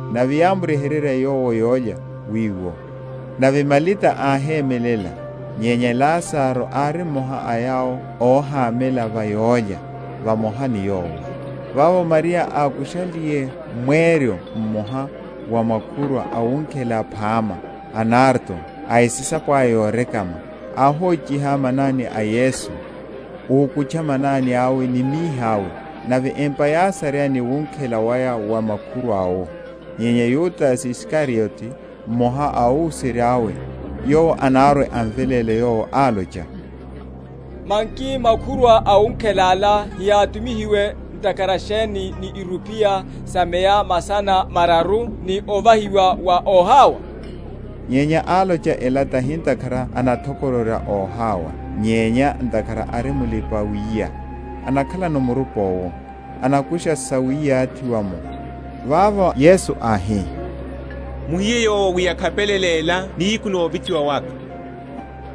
Nave yámryeheryela Yowo yólya wiwo; nave Malita áhemelela; nyenya Lazaro ári mmoha a yawo óhamela va yólya vamoha ni Yowo. Vavo Mariya ákushaliye mweryo mmoha wa makhurwa awunkhela phama a nardo a esisapo aya yorekama áhochiha manani a Yesu, úkutcha manani awe ni mihi awe; nave empa yásareya ni wunkhela waya wa makhurwa’wo Nyenya Yudase Isikariote, mmoha a óhuserya’we, yowo anarwe?-?amveléle Yowo, álocha, Manki makhurwa awunkhela ala heyátumihiwe ntakhara sheni ni irupiya sa meya masana mararu, ni ovahiwa wa óhawa? Nyenya álocha ela tahi ntakhara ánathokororya óhawa, nyenya ntakhara ári mulipa‐wiya, anakhalano murupa owo, anakusha sawiyathiwa’mo. Vavo Yesu áhi, Muhiye yowo wi ákhapelela ela nihiku novithiwa waka.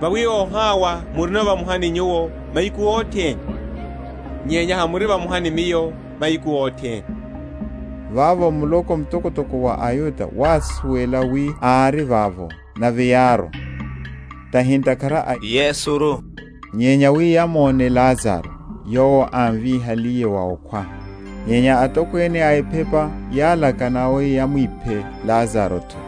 Vawi óhawa murino vamoha ni nyuwo mahiku othene; nyenya hamuri vamoha ni Miyo mahiku othene. Vavo muloko mtokotoko wa aYuda wásuwela wi ári vavo; nave yárwa, tahi ntakhara a Yesuru, nyenya wi yamóne Lazaro, yowo ámvíhaliye wa okhwa. Nyenya atokwene a ephepa yálakana wi yamwiphe Lazaro’tho;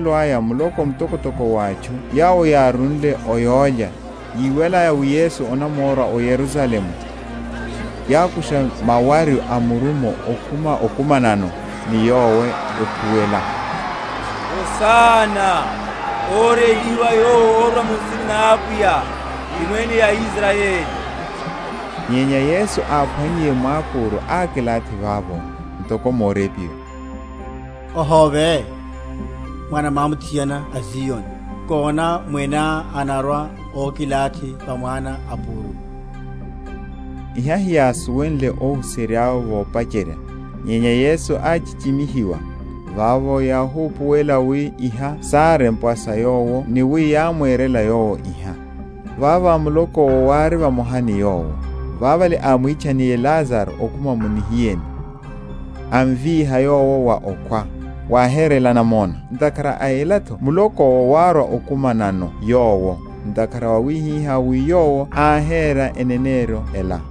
Woshishelo aya muloko mtokotoko wa atchu yawo yárwile o yólya, yíwalaya wi Yesu anamorwa o Yerusalemu, yákusha mawaryu a murumo, ekhuma okumana ni Yowo, ekhuwela, Hosana, Órélihiwa yowo órwa mu nsina na Apwiya, ti Mwene a Israyeli. Nyenya Yesu, áphwannyiye mwápúru ákilathi vavo; ntoko morepiwa; Ohóve, mwana mwámuthiana a Zioni: nkona Mweneá anarwa ókilathi va mwana a púru. Iha heyásuwenle óhuserya’we vopacherya: nyenya Yesu áchichimihiwiye, vavo yáhupuwela wi iha sárempwa sa Yowo, ni wi yámwerela Yowo iha. Vavo muloko’wo wári vamoha ni Yowo, vavale ámwitchanniye Lazaro okhuma mu nihiyeni, amvíha yowo wa okhwa, wáherela namona. Ntakhara a ela’tho muloko’wo wárwa okumanano Yowo, ntakhara wáhiwa wi Yowo áhera eneneryo ela.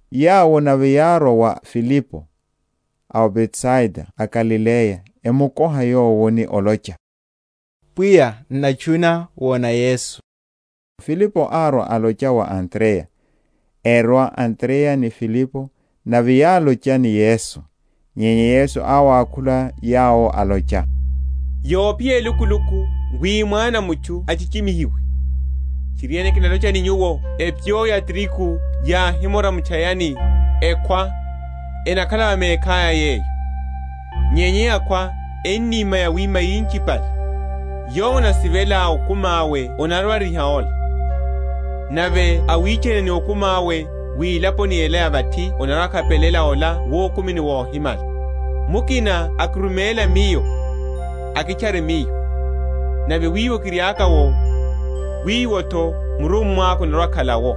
Yawo nave yárwa wa Filipo, a o Betsaida a Galileya, emukoha yowo, ni olocha, Pwiya, n’natchuna wona Yesu. Filipo árwa alocha wa Andreya: erwa Andreya ni Filipo, nave yálocha ni Yesu. Nyenya Yesu áwakhula yawo, alocha, Yophiya elukuluku, wi Mwana a mutchu achichimihiwe. Tchiriene, kinalocha ni nyuwo, Epyo ya trigu yáhimora mu’tchayani, ekhwa, enakhala va mekhaya yeyo; nyenya yakhwa, eníma yawíma yinchipale. Yowo anasivela okumi awe anarwa‐ariha ola; nave awichana ni okumi awe mwilaponi ela ya vathi anarwa‐akhapelela ola wukumini wohimala. Mukina akiruméla Miyo, akitchare Miyo; nave wiwo kiriaka’wo, wiwo’tho murummwa’ka anarwa‐akhala’wo.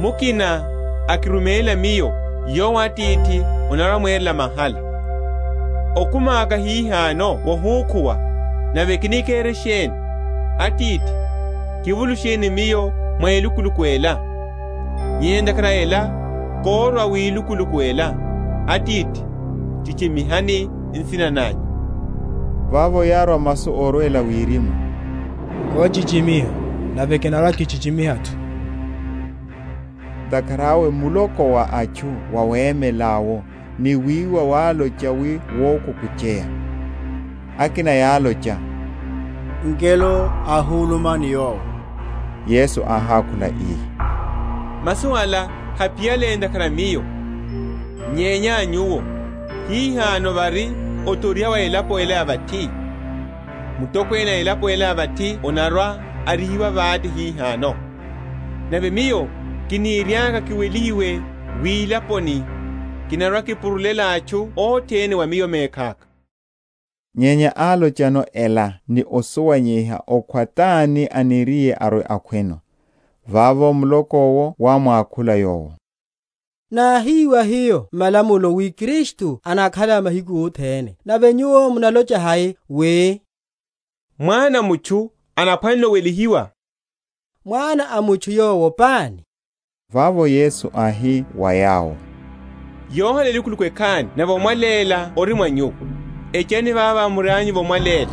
Mukina akiruméla Miyo, yowo Atithi anarwa‐amwerela mahala. Okumi aka hihano wohukhuwa; nave kini kere sheni? Atithi, kivulusheni Miyo mwa elukuluku ela. Nyenya ntakhara a ela kórwa wilukuluku ela. Atithi, chichimihani nsina nanyu. Vavo yárwa masu órwela wirimu, Kochichimiha, nave kinarwa‐kichichimiha’tho. Ntakhara awe muloko wa atchu wawemela’wo, ni wiwa, wálocha wi wokukucheya. Akina yálocha, Ngelo ohuluma ni Yowo. Yesu áhákhula ii, Masu ala haphiyale ntakhara a Miyo, nyenya a nyuwo. Hihano vari othoriha wa elapo ela ya vathi; mutokwene a elapo ela ya vathi anarwa‐arihiwa vate hihano. Nave Miyo, kiniriaka kiwelihiwe wilaponi, kinarwakipurulela atchu othene wa Miyo mekhaka. Nyenya álocha ela ni osuwanyeiha okhwa tani aniriye arwe‐akhweno. Vavo muloko’wo wámwakhula Yowo, Náhiwa hiyo m’malamulo wi Kristu anakhala mahiku othene; nave Nyuwo munalocha hai, wi Mwana a mutchu anaphwanela owelihiwa? Mwana a mutchu yowo pani? Vavo Yesu áhi wa yawo, Yohala elukuluku ekhani nave omwaléla ori mwa nyuwo. Echani vavo murianyuno omwaléla,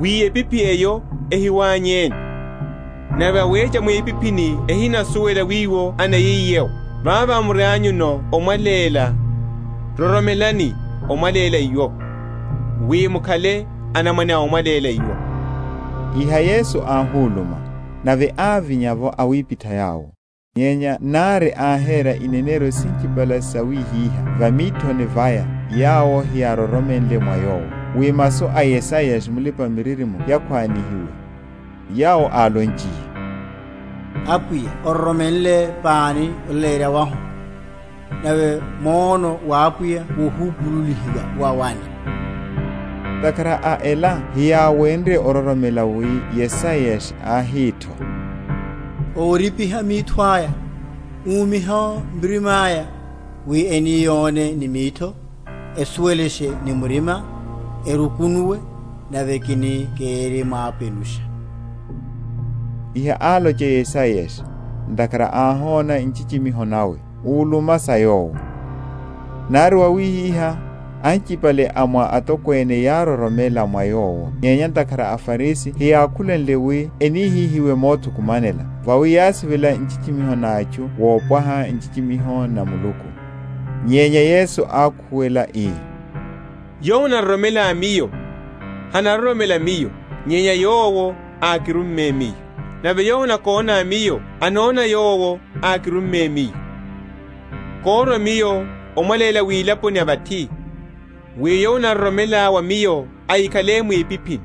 wi epiphi eho, hwanyeni; nave awecha mwipiphini hanasuwela wiwo anayiye’wo. Vavo murianyuno omwaléla, roromelani omwaléla iwo, wi mukhale anamwane a omwaléla iwo. Iha Yesu áhuluma, nave ávinya’vo awipitha yawo. Nyenya nari áhera ineneryo sinchipale sawihiha va mithoni vaya yawo heyároromenle mwa Yowo; wi masu a Yesaya Mulipa‐miririmo yakhwanihiwe, yawo álonchiye, Apwiya ororomenle pani olaleyerya wahu? Nave mwono wa Apwiya wohupululihiwa wa wani? Ntakhara a ela heyáwenrye ororomela, wi Yesaya áhi’tho, Óripiha mitho aya, Úmiha murima’ya; Wi eni yone ni mitho, Esuwelashe ni murima, Erukunuwe, Nave kini kirimwapenusha. Iha álocha Yesaya, ntakhara áhona nchichimiho nawe; úluma sa Yowo. Nari wawihihá, anchipale a mwa atokwene yároromela mwa Yowo; nyenya ntakhara a aFarisi heyákhulenle wi enihihiwe mothukumanela, vawi yásivela nchichimiho na atchu wopwaha nchichimiho na Muluku. Nyenya Yesu ákhuwela ii, Yowo anaroromela Miyo, hanaroromela Miyo, nyenya Yowo ákirumme Miyo. Nave yowo anakóna Miyo anona Yowo ákirumme Miyo. Kórwa Miyo omwaléla wilaponi ya vathi, wi yowo anaroromela wa Miyo ahikhale mwipiphini.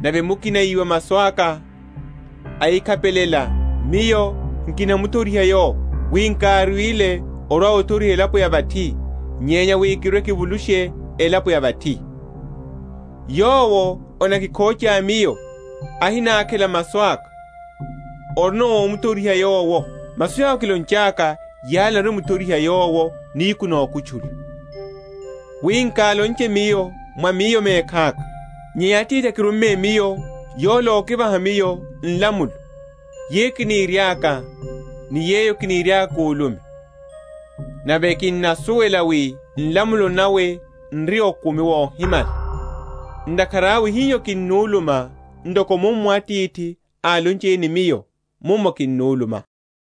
Nave mukina íwa masu aka, ahikhapelela, Miyo nkimuthoriha yowo: wi nkárwile orwa‐othoriha elapo ya vathi, nyenya wi kirwe‐kivulushe elapo ya vathi. Yowo anakikhocha Miyo, ahinákhela masu aka, orino ómuthoriha yowo: masu yawo kilonchaka, yala enarwa‐emuthoriha yowo nihiku nokutchula. Wi nkálonche Miyo mwa Miyo mekhaka; nyenya Atithi ákirumme Miyo, yola ákivaha Miyo nlamulo, yeyo kiniriaka, ni yeyo kiniriaka kulume. Nave kinnasuwela wi nlamulo nawe n’ri okumi wohimala: ntakhara awe hiho kinnuluma, ntoko mummo Atithi álonchiye ni Miyo, mummo kinnuluma.